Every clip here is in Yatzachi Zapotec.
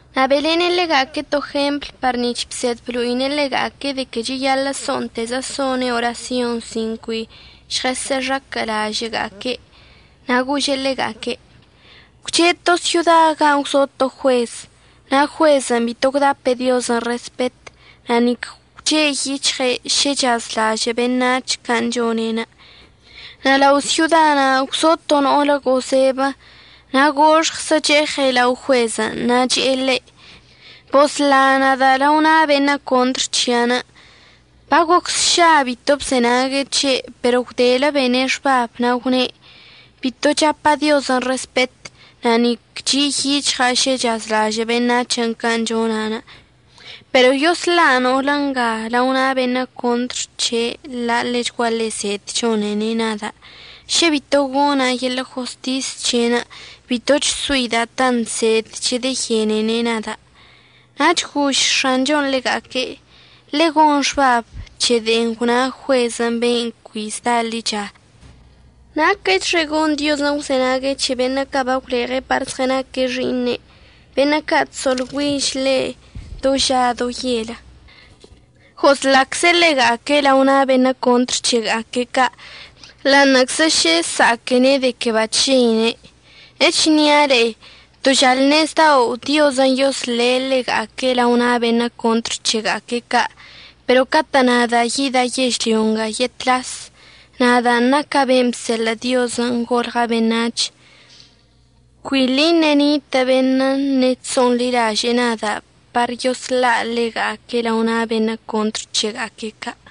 Na' be'elene' ḻega'aque' to jempl par nic̱h bsed blo'ine' ḻega'aque' de que cheyaḻə' so'ontezə so'one' orasyon sin cui žɉəx̱aquə'əlažə'əga'aque'. Na' gože' ḻega'aque': ―Gwche' to syoda gan' gwzo to juez. Na' juezən' bito gwdape' Diozən' respet na' nic gwche' yic̱hɉe' šə chsa'azlažə' beṉac̱hən' can' chone'enə'. Na' lao syodan' gwzo to no'olə gozebə na' goxɉzə cheɉe' lao juezən' na' che'e ḻe': “Bosla nada' lao na' beṉə' contr c̱hia'anə'.” Bagoc sša bito bzenague' c̱he', pero gwdelə bene' xbabən' na' gwne': “Bito chapa' Diozən' respet na' nic chi' yic̱hɉa' šə chsa'azlažə' beṉac̱hən' can' chona'. Pero yosla' no'olə nga lao na' beṉə' contr c̱he' la' ḻechguaḻe zed chone'ene' nada'. Šə bito gona' yeḻə' jostis c̱he'enə' bitoch soida' tant zed chedeyenene' nada'.” Nach gož X̱anchon' ḻega'aque': ―Ḻe'e gon xbab c̱he de'en gwna juezən' ben' cui zda ḻicha. Naquəchxe gon Diozən' gwzenague' c̱he beṉə' ca' bagwleɉe' par zɉənaque' xi'iṉe', beṉə' ca' chso'olgüiž ḻe' do ža do yel. Goslacze' ḻega'aque' lao na' beṉə' contr c̱hega'aque' ca' ḻa'aṉə'əczə šə əsa'aquene' de que bachžeine'. Echnia' le'e, to žalṉezdao' Diozən' yosle' ḻega'aque' lao na' beṉə' contr c̱hega'aque' ca'. Pero catə' nada' yida' yežlyo nga yetlas, nadan' naca' ben' bseḻə' Diozən' golɉa' beṉac̱h, cuili ṉe'e ṉitə' beṉə' ṉe'e chso'onḻilaže'e nada' par yosla' ḻega'aque' lao na' beṉə' contr c̱hega'aque' ca'.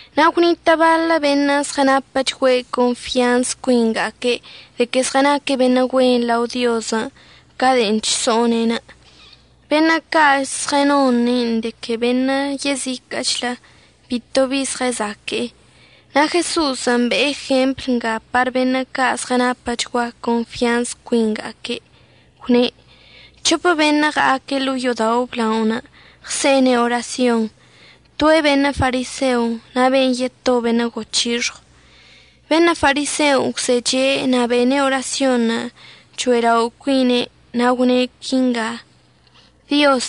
Na' gwnitə' baḻə' beṉə' zɉənapəchgua confyanz cuinga'aque' de que zɉənaque' beṉə' güen lao Diozən' ca de'en chso'one'enə'. Beṉə' ca' zɉənone'en de que beṉə' yeziquə'əchlə bito bi zɉəzaque'e. Na' Jeso'osən' be'e jempl nga par beṉə' ca' zɉənapəchgua confyanz cuinga'aque', gwne': ―C̱hopə beṉə' ɉa'aque' ḻo'o yo'odao' əblaonə' ɉse'ene' orasyon, toe' beṉə' fariseo na' ben' yeto beṉə' goc̱hixɉw. Beṉə' fariseon' gwzeche' na' bene' orasyonṉə' cho'elao' cuine' na' gwne' quinga: “Dioz,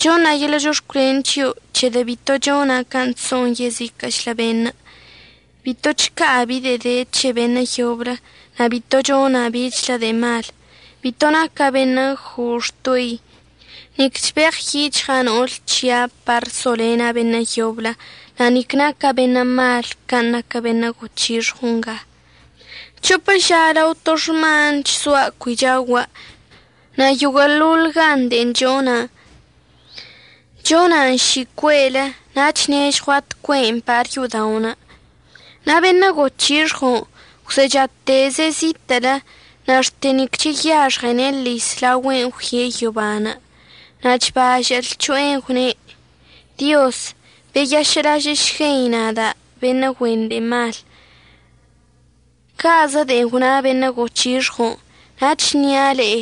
choṉa' yeḻə' chox̱cwlen c̱hio' c̱hedə' bito chona' can' chso'on yeziquə'əchlə beṉə'. Bito chca'a bi de'e de c̱he beṉə' yoblə, na' bito chona' bichlə de'e mal. Bito naca' beṉə' ggo'o xtoi, nic chbeɉyic̱hɉa' no'ol c̱hia' par solena' beṉə' yoblə, na' nic naca' beṉə' mal can' naquə beṉə' goc̱hixɉw nga. C̱hopə ža lao to xman chzoa' cui chaogua'. Na' yoguə'əḻoḻ gan de'en chona', chona'an ši cue'elə na' chnežɉua' tcue'en par yo'oda'onə'.” Na' beṉə' goc̱hixɉon' gwzechateze' zitə'ələ, na' xte nic cheyaxɉene' əḻis laogüe'enə' əggüie' yoban', na' chbažə' lc̱ho'enə' gwne': “Dioz, beyašə'əlažə'əšguei nada' beṉə' güen de'e mal.” Ca'azə de'e gwna beṉə' goc̱hixɉon'. Na' əchnia' le'e,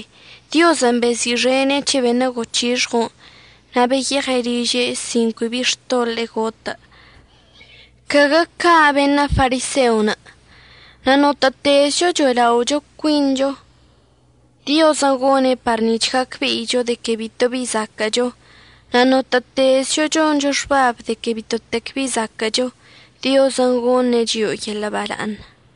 Diozən' bezi'ixene' c̱he beṉə' goc̱hixɉon', na' beyeɉe' liže' sin cui bi xtoḻe'e gotə'. Caguə ca' beṉə' fariseon'. Na' notə'ətezcho cho'elao' cuincho, Diozən' gone' par nic̱h gacbe'icho de que bitobi zaquə'əcho. Na' notə'ətezcho choncho xbab de que bitotec bi zaquə'əcho, Diozən' goṉe' chio'o yeḻə' bala'aṉ.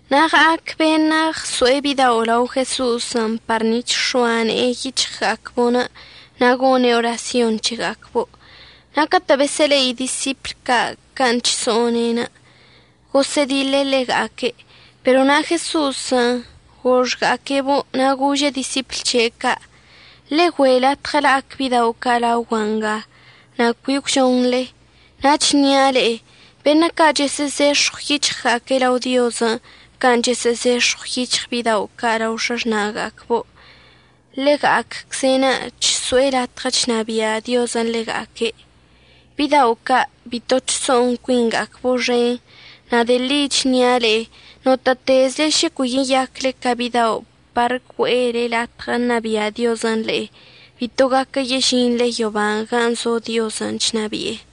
Na' ɉa'ac beṉə' ɉso'e bidao' lao Jeso'osən' par nic̱h əx̱oa ne'enə' yic̱hɉga'acbo' na' gone' orasyon c̱hega'acbo'. Na' catə' besə'əle'i disipl ca' can' chso'one'enə', gosə'ədiḻe' ḻega'aque'. Pero na' Jeso'osən' goxga'aque'ebo' na' gože' disipl c̱he' ca': ―Ḻe'e güe' latɉə la'ac bidao' ca' laogua' nga, na' cui əgwžonḻe. Na' əchnia' le'e, beṉə' ca' chəsə'əzex̱ɉw yic̱hɉga'aque' lao Diozən' can' chəsə'əzex̱ɉw yic̱hɉ bidao' ca' lao x̱axna'aga'acbo', ḻega'acze'enə' chso'e latɉə chnabia' Diozən' ḻega'aque'. Bidao' ca' bito chso'on cuinga'acbo' xen, na' de'e ḻi chnia' le'e, notə'ətezle šə cui yeyacle ca bidao' par güe'ele latɉə ṉabia' Diozən' le'e, bito gaquə yežinḻe yoban' gan' zo Diozən' chnabi'e.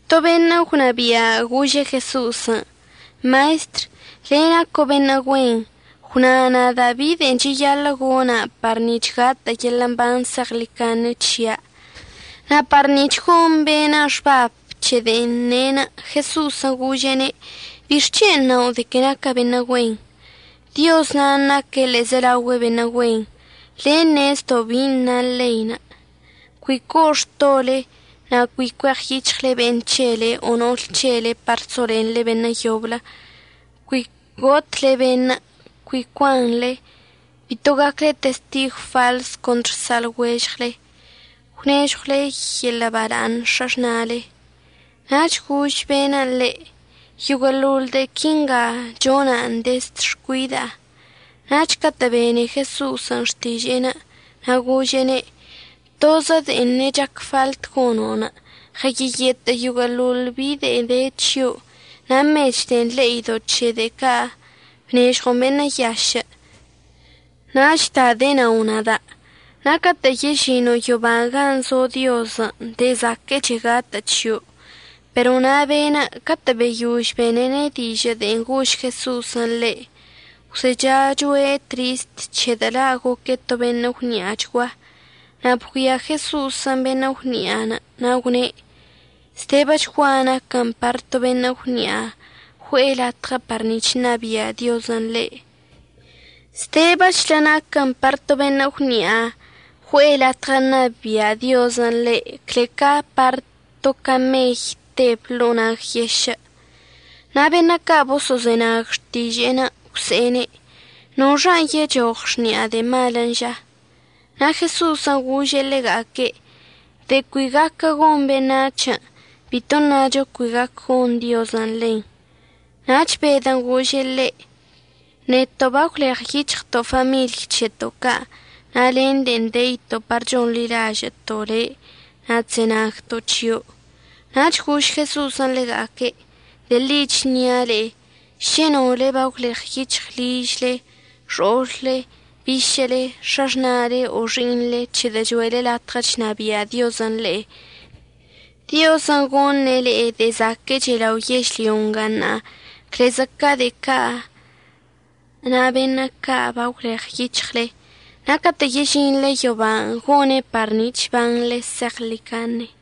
To beṉə' gwnabia' gože' Jeso'osən': ―Maestr, le' naco' beṉə' güen, gwna nada' bi de'en cheyaḻə' gona' par nic̱h gatə' yeḻə' mban zeɉḻicaṉe c̱hia'. Na' par nic̱h gon be'enə' xbab c̱he de'en ne', Jeso'osən' gože'ene': ―¿Bixc̱hen' nao' de que naca' beṉə' güen? Dioz nan' naque' ḻe'ezelaogüe beṉə' güen. Le' ṉezdo' bin' na ḻein': “Cui co'o xtole, na' cui cueɉyic̱hɉle be'en c̱hele o no'ol c̱hele par solenḻe beṉə' yoblə; cui gotle beṉə'; cui cuanḻe; bito gacle testigw faḻs contr sa'alɉuežɉle; gwnežɉwle yeḻə' bala'aṉ x̱axna'ale.” Nach gož be'en ḻe': ―Yoguə'əḻoḻ de'e quinga chona'an dezd xcuida'a. Nach catə' bene Jeso'osən' xtiže'en na' gože'ene': ―Tozə de'en ṉe'e chac faḻt gono'. Ɉəyeyetə' yoguə'əḻoḻ bi de'e de c̱hio', na' mech de'en le'ido' c̱he de'e ca' bnežɉon beṉə' yašə', nach da denao nada'. Na' catə' yežino' yoban' gan' zo Diozən', de'e zaquə'əche gatə' c̱hio'. Pero na' be'enə' catə' beyož benene' dižə' de'en gož Jeso'osən' ḻe', gwzechachoe' trist, c̱hedə' la' goque' to beṉə' gwni'achgua. Na' bgüia Jeso'osən' beṉə' gwni'anə', na' gwne': ―Zdebəchgua naquən par to beṉə' gwni'a güe'e latɉə par nic̱h ṉabia' Diozən' ḻe'. Zdebəchlə naquən par to beṉə' gwni'a güe'e latɉə ṉabia' Diozən' ḻe' cle ca par to camey teb to ḻo'o nag yešə'. Na' beṉə' ca' boso'ozenague' xtiže'enə' gwse'ene': ―¿Noxan' yechoɉ xni'a de'e malən' ža? Na' Jeso'osən' gože' ḻega'aque': ―De'en cui gaquə gon beṉac̱hən', bito ṉacho cui gaquə gon Diozən' ḻen. Nach Bedən' gože' ḻe': ―Neto' bagwleɉyic̱hɉto' famiḻy c̱heto' ca' na' len de'en deito' par chonḻilažə'əto' le' na' chzenagto' c̱hio'. Na' gož Jeso'osən' ḻega'aque': ―De'e ḻi chnia', šə nole bagwleɉyic̱hɉle ližle, xo'olle, bišə'əle, x̱axna'ale o xi'iṉle c̱hedə' cho'ele latɉə chnabia' Diozən' le'e, Diozən' goṉe' le'e de'e zaquə'əche lao yežlyo nga ṉa'a clezə ca de'e ca' na' beṉə' ca' bagwleɉyic̱hɉle. Na' catə' yežinḻe yoban' gone' par nic̱h əbanḻe zeɉḻicaṉe.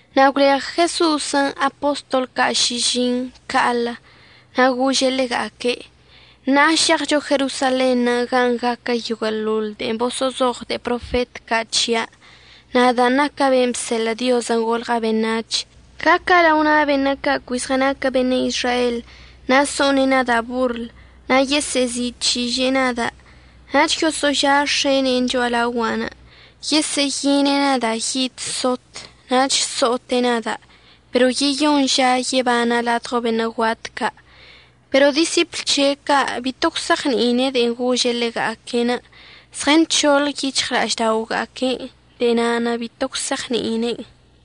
Na' gwleɉ Jeso'osən' apostol ca' šižiṉ ca'alə, na' gože' ḻega'aque': ―Ṉa'a šeɉcho Jerosalenṉə' gan' gaquə yoguə'əḻoḻ de'en baboso'ozoɉ de'e profet ca' c̱hia', nadan' naca' ben' bseḻə' Diozən' golɉa' beṉac̱h. Gaca' lao na' beṉə' ca' cui zɉənaquə beṉə' Izrael, na' so'one' nada' borl na' yesə'əzi'ic̱hiže'e nada', nach yoso'oža' x̱ene'e cho'alaogua'anə'. Yesə'əyine' nada' yid sot nach so'ote' nada', pero yeyoṉ ža yebana' ladɉo beṉə' guat ca'. Pero disipl c̱he' ca' bito gwse'eɉni'ine' de'en gože' ḻega'aque'. Zɉənc̱hoḻ yic̱hɉla'ažda'oga'aque'enə', de'e na'anə' bito gwse'eɉni'ine'en.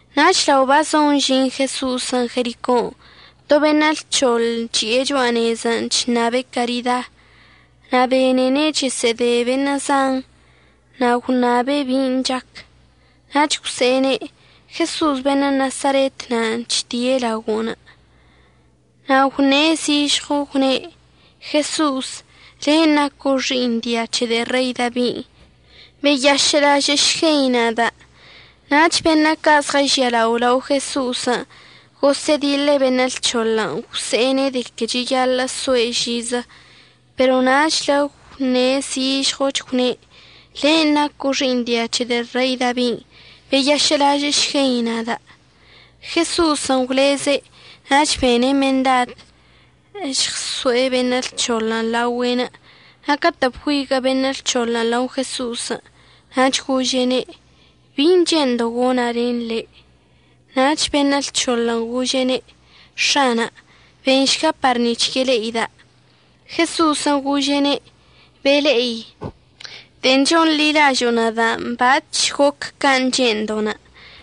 Nach lao bazon əžin Jeso'osən' Jericon', to beṉə' lc̱hoḻ chi'e cho'a nezən' chṉabe' carida. Na' benene' chesə'əde beṉə' zan, na' gwṉabe' bin' chac. Nach gwse'ene': ―Jeso'os beṉə' Nasaretən' chdie' laogo'onə'. Na' gwṉe' zižɉo gwne': ―Jeso'os, len' naco' xi'iṉ dia c̱he de'e Rei Dabin', ¡beyašə'əlažə'əšguei nada'! Nach beṉə' ca' zɉəžialao lao Jeso'osən' gosə'ədiḻe' beṉə' lc̱hoḻən' gwse'ene' de que cheyaḻə' soe' žizə, pero nachle gwṉe' zižɉochlə gwne': ―Len' naco' xi'iṉ dia c̱he de'e Rei Dabin', ¡beyašə'əlažə'əšguei nada'! Jeso'osən' gwleze' nach bene' mendad əžɉso'e beṉə' lc̱hoḻən' laogüe'enə' na' catə' bgüiguə' beṉə' lc̱hoḻən' lao Jeso'osən' nach gože'ene': ―¿Bi che'endo' gona' len le'? Nach beṉə' lc̱hoḻən' gože'ene': ―X̱ana' benšga par nic̱h yele'ida'. Jeso'osən' gože'ene': ―Bele'i. De'en chonḻilažo'o nada' bac̱h goc can' che'endo'onə'.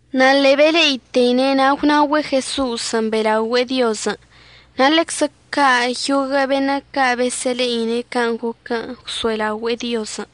Na' ḻe'e bele'iteine' na' gwnaogüe' Jeso'osən' be'elaogüe'e Diozən', na' ḻeczə ca' yoguə' beṉə' ca' besə'əle'ine' can' goquən' gwso'elaogüe'e Diozən'.